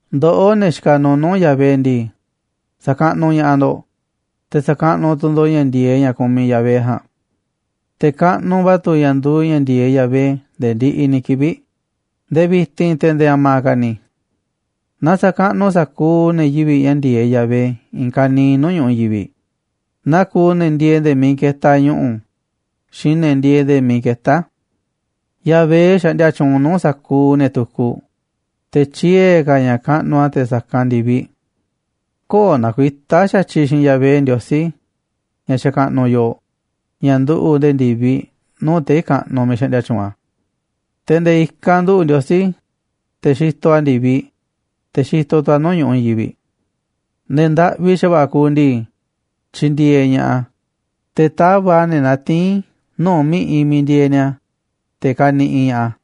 Ndoꞌó, ne̱ xikaꞌ nuuꞌ nuu̱ꞌ Yahvé ndii, sa̱kaꞌnuꞌ ña̱ꞌaꞌ ndo̱ꞌ, te̱ sa̱kaꞌnuꞌ tu̱ ndo̱ꞌ ña̱ ndi̱e̱eꞌ ña̱ kumiꞌ Yahvé ja̱a̱nꞌ. Te̱ kaꞌnuꞌ va̱ tu̱ ña̱ nduuꞌ ña̱ ndi̱e̱eꞌ Yahvé nde̱e̱ ndiꞌiꞌ ni̱ kivi̱ꞌ, nde̱e̱ vi̱ti̱n, te̱ nde̱e̱ a̱ma̱ ka̱ ni̱. Na sa̱kaꞌnuꞌ sa̱kuuꞌ ne̱ yivi̱ꞌ ña̱ ndi̱e̱eꞌ Yahvé i̱i̱n ka̱niiꞌ nuu̱ꞌ ñu̱ꞌuꞌ i̱i̱n yivi̱ꞌ, naa kuuꞌ ne̱ ndieeꞌ nde̱e̱ miiꞌ ketaꞌ ñu̱ꞌu̱ xiinꞌ ne̱ ndieeꞌ nde̱e̱ miiꞌ ketá a̱. Yahvé xaꞌndia tyuunꞌ nuu̱ꞌ sa̱kuuꞌ ne̱ tukuꞌ, te̱ tyiee̱ ka̱ ña̱ kaꞌnuꞌ a̱ te̱ sa̱kanꞌ ndi̱viꞌ. Köo̱ꞌ nakuitá xa̱tyiꞌ xiinꞌ Yahvé, Ndiosí ña̱ xakaꞌnuꞌ yooꞌ, ña̱ nduꞌu̱ꞌ nde̱e̱ ndi̱viꞌ, nuu̱ꞌ tei̱ kaꞌnuꞌ miiꞌ xaꞌndia tyuunꞌ a̱. Te̱ nde̱e̱ i̱kanꞌ nduꞌu̱ꞌ Ndiosí, te̱ xitoꞌ a̱ ndi̱viꞌ, te̱ xi̱to̱ tu̱ a̱ nuu̱ꞌ ñu̱ꞌuꞌ i̱i̱n yivi̱ꞌ. Ne̱ ndaꞌvi xa̱va̱ꞌa̱ kuuꞌ ndii, tyindieeꞌ ña̱ꞌaꞌ a̱, te̱ tava̱ꞌ a̱ ne̱ natiín nuu̱ꞌ mi̱ꞌiꞌ miiꞌ ndieeꞌ ni̱a̱, te̱ kaniꞌiꞌ ña̱ꞌaꞌ a̱.